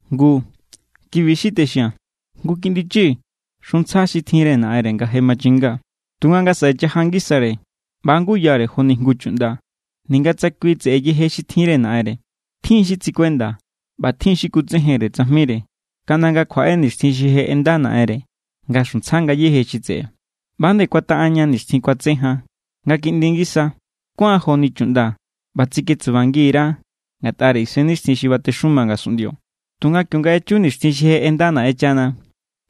Ngu, kibi= xi texia̱n. Jngu kiꞌndi chi xuntsja xi tjinre naꞌenre nga je machinga. Tunga nga saꞌe chaja ngisare, ꞌba= nguyare joni jngu chuꞌnda, ninga tsa kui tseꞌe yeje xi tjinre naꞌenre. Tjin= xi tsikuenda ꞌba tjin= xi kutsejenre tsajmire, kaꞌnda nga kjuaꞌe nixtjin xi je ꞌenda naꞌenre nga xuntsja ngayéje xi tseꞌe. ꞌBa ꞌba=nde kuataꞌan ña nixtjin kuatse jan nga kiꞌndi ngisa. Kuáan joni chuꞌnda ꞌba tsiketsubangi_ra ngatꞌare isennixtjin xi batexuma ngasunꞌndio. Tunga kionga echu nixtjin xi je ꞌenda Naꞌenchana,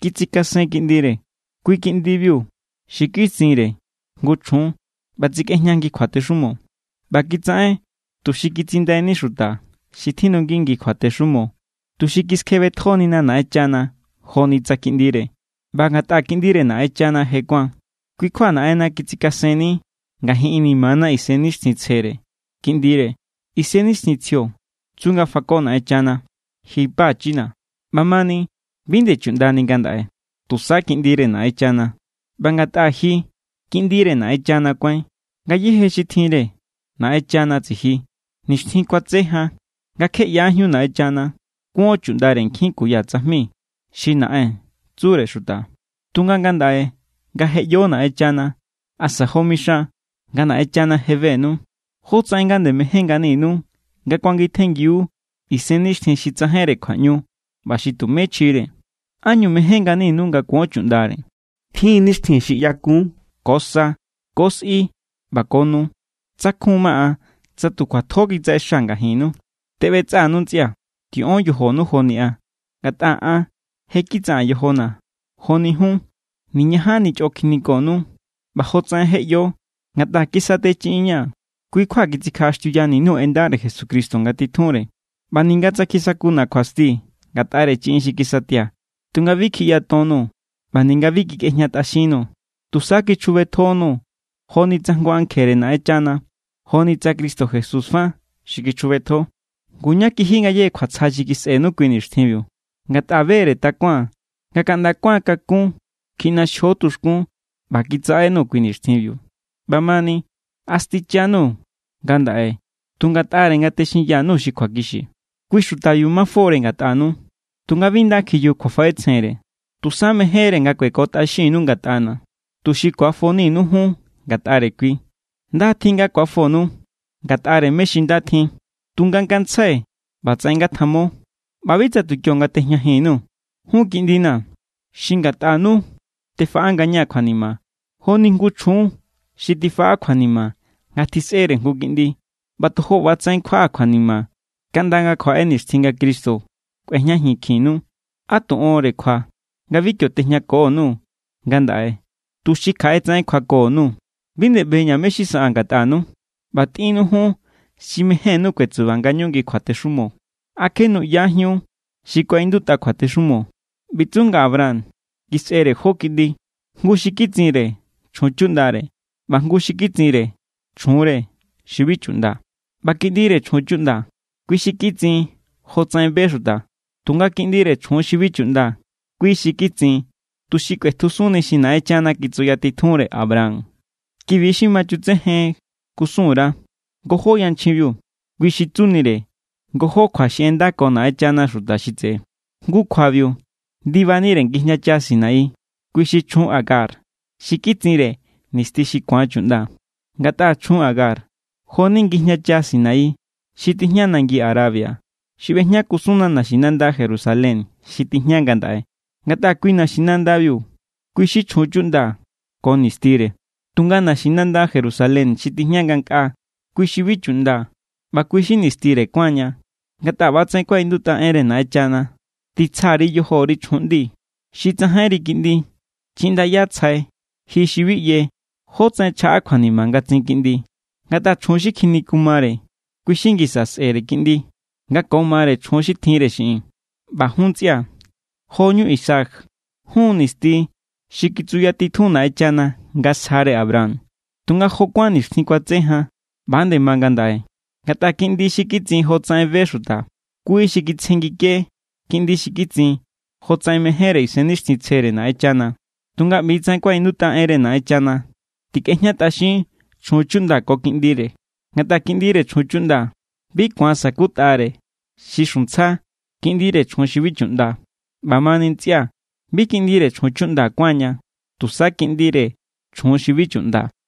kitsikasen Kiꞌndire. Kui Kiꞌndibiu xi kitsinre jngu chjun ꞌba tsikꞌejña ngi kjuatexumo. ꞌBa kitsaꞌen tuxi kitsindaini xuta xi tjindu ngi kjuatexumo, tuxi kiskjebetjonina Naꞌenchana joni tsa kiꞌndire. ꞌBa ngatꞌa kiꞌndire Naꞌenchana je kuáan, kui= kjua Naꞌenna kitsikasenni ngajin inimana Isennixtjintsjere Kiꞌndire. Isennixtjintsjio tsu nga fako Naꞌenchana: “¡Ji Pachina̱!” ꞌBamani, bi nde chuꞌndani ngandaꞌe, tusa kiꞌndire Naꞌenchana. ꞌBa ngatꞌa ji kiꞌndire Naꞌenchana kuáin, ngayéje xi tjinre Naꞌenchana tsiji. Nixtjin kuatse jan, nga kje ꞌyajíun Naꞌenchana, kuon chuꞌndare nkjin kuya tsajmi xi “naꞌen” tsure xuta. Tunga ngandaꞌe nga je ꞌyo Naꞌenchana, asa jo mixan nga Naꞌenchana je benu, ¿jótsaꞌen nga nde mején nganinu nga kuangitjenngiu isennixtjin xi tsajainre kjuaꞌñu ꞌba xi tumé chjire? ¿Ánñu mején nganinu nga kuon chuꞌndare? Tjin= nixtjin xi ꞌyakun, ko sa, ko sꞌi ꞌba ko nu. Tsakjun ma an, tsa tu kjuatjo kitsaꞌexaa̱ ngajinnu. Teꞌbetsꞌa_nuu̱ ntsꞌia̱. Tiꞌon yojonu joni an. Ngatꞌa an je= kitsaꞌaa̱n yojona̱ joni jun. Niñajanni chꞌo kjinikonuu̱. ꞌBa jotsaꞌen je ꞌyo, ngatꞌa kisatechiꞌinña̱, kui= kjua kitsikjaꞌaxtiuyani_nuu̱ en ndare Jesucristo nga titjunre. ꞌBa ninga tsa kisakunu kjuasti ngatꞌare chiꞌin xi kisatia̱, tunga bi kjiꞌyatonnuu̱ ꞌba ninga bi kikꞌejñatꞌaxinnuu̱. Tusa kichjubetjonuu̱ joni tsa an jngu ankjere Naꞌenchana, joni tsa Cristo Jesús fa xi kichjubetjo. Ngu, ¿ñá kiji ngayéje kjuatsja xi kisꞌenu kui nixtjinbiu? Ngatꞌa be=re takuaa̱n nga kaꞌnda kuáan kakún kjiꞌnaxjio tuxkún ꞌba kitsaꞌenuu̱ kui nixtjinbiu. ꞌBamani, ¿a stichanuu̱ ngandaꞌe tu ngatꞌare nga texinya_nuu̱ xi kjuakixi? Kui xutabiu mafo=re ngatꞌanu, tunga bi nda kjiyuju kjuafaꞌetsjenre. Tusa mejénre nga kuekotꞌaxinnu ngatꞌana̱, tuxi ku̱afoninu jun ngatꞌare kui. Nda= tjin nga ku̱afonu ngatꞌare mé= xi nda tjin. Tunga ngantsjai ꞌbatsaꞌen ngatjamo, ꞌba bi tsa tu kionga tejñajin_nuu̱. Jun kiꞌndina̱, xi ngatꞌanu tefaꞌa ngañaa̱ kjuanima, joni jngu chjun xi tifaꞌa kjuanima nga tjisꞌere jngu kiꞌndi. ꞌBa tojo ꞌba=tsaꞌen kjuaꞌaa̱ kjuanima kaꞌnda nga kjuaꞌe nixtjin nga Cristo kꞌuejñajinkjinnu. ¡Á tu onre kjua nga bi kio tejñako_nuu̱ ngandaꞌe, tuxi kjaꞌe tsaꞌen kjuako_nuu̱! ¡Bi nde ꞌbeña̱ mé= xi saꞌaa̱n ngatꞌanu! ꞌBa tꞌinnu jun xi mejénnu kuetsuba ngañu ngi kjuatexumo. ¿A kje nuꞌyajíun xi kuaꞌindutꞌa kjuatexumo? ꞌBi tsu nga Abraham kisꞌere jó kiꞌndi, jngu xi kitsinre chjun chuꞌndare ꞌba jngu xi kitsinre chjunre, xi bi chuꞌnda. ꞌBa kiꞌndire chjun chuꞌnda, kui xi kitsin jotsaꞌen be xuta. Tunga kiꞌndire chjun xi bi chuꞌnda, kui xi kitsin tuxi kꞌuetjusunni xi Naꞌenchana kitsuyatitjunre Abraham. Ki=bi xi ma chutsejen kusun_ra. Ngojó yanchjinbiu, kui xi tsunire ngojó kjua xi ꞌendako Naꞌenchana xuta xi tseꞌe. Jngu kjuabiu ndibanire ngijñacha Sinaí. Kui xi chjun Agar, xi kitsinre nisti xi ku̱an chuꞌnda. Ngatꞌa chjun Agar jo=ni ngijñacha Sinaí xi tijña nangi Arabia, xi ꞌbejña kusunna naxinanda Jerusalén xi tijña ngandaꞌe. Ngatꞌa kui naxinandabiu, kui xi chjun chuꞌnda ko nistire. Tunga naxinanda Jerusalén xi tijña ngankꞌaa, kui xi bi chuꞌnda ꞌba kui xi nistire kuáan ña. Ngatꞌa ꞌbatsaꞌen kuaꞌindutꞌa enre Naꞌenchana: Titsja_ri yojori chjun ꞌndi xi tsajainri kiꞌndi. Chiꞌndaya tsjai ji xi bi ꞌye jótsaꞌen chjaꞌa kjuanima nga tsin kiꞌndi. Ngatꞌa chjun xi kjinikumare, kui xi ngisa sꞌe̱re kiꞌndi nga ko mare chjun xi tjinre xiꞌin. ꞌBa jun ntsꞌia̱, joñu Isaac. Jun= nisti xi kitsuyatitjun Naꞌenchana nga sjare Abraham. Tunga jo kuán nixtjin kuatse jan, ꞌba=nde ma ngandaꞌe. Ngatꞌa kiꞌndi xi kitsin jotsaꞌen be xuta, kui xi kitsjengike kiꞌndi xi kitsin jotsaꞌen mejénre Isennixtjintsjere Naꞌenchana. Tunga ꞌbi= tsaꞌen kuaꞌindutꞌa enre Naꞌenchana: “Tikꞌejñatꞌaxin chjun chuꞌnda ko kiꞌndire. Ngatꞌa kiꞌndire chjun chuꞌnda bi ku̱an sa̱kutꞌare xi xuntsja kiꞌndire chjun xi bi chuꞌnda.” ꞌBamani, ntsꞌia̱, bi kiꞌndire chjun chuꞌnda kuáan ña, tusa kiꞌndire chjun xi bi chuꞌnda.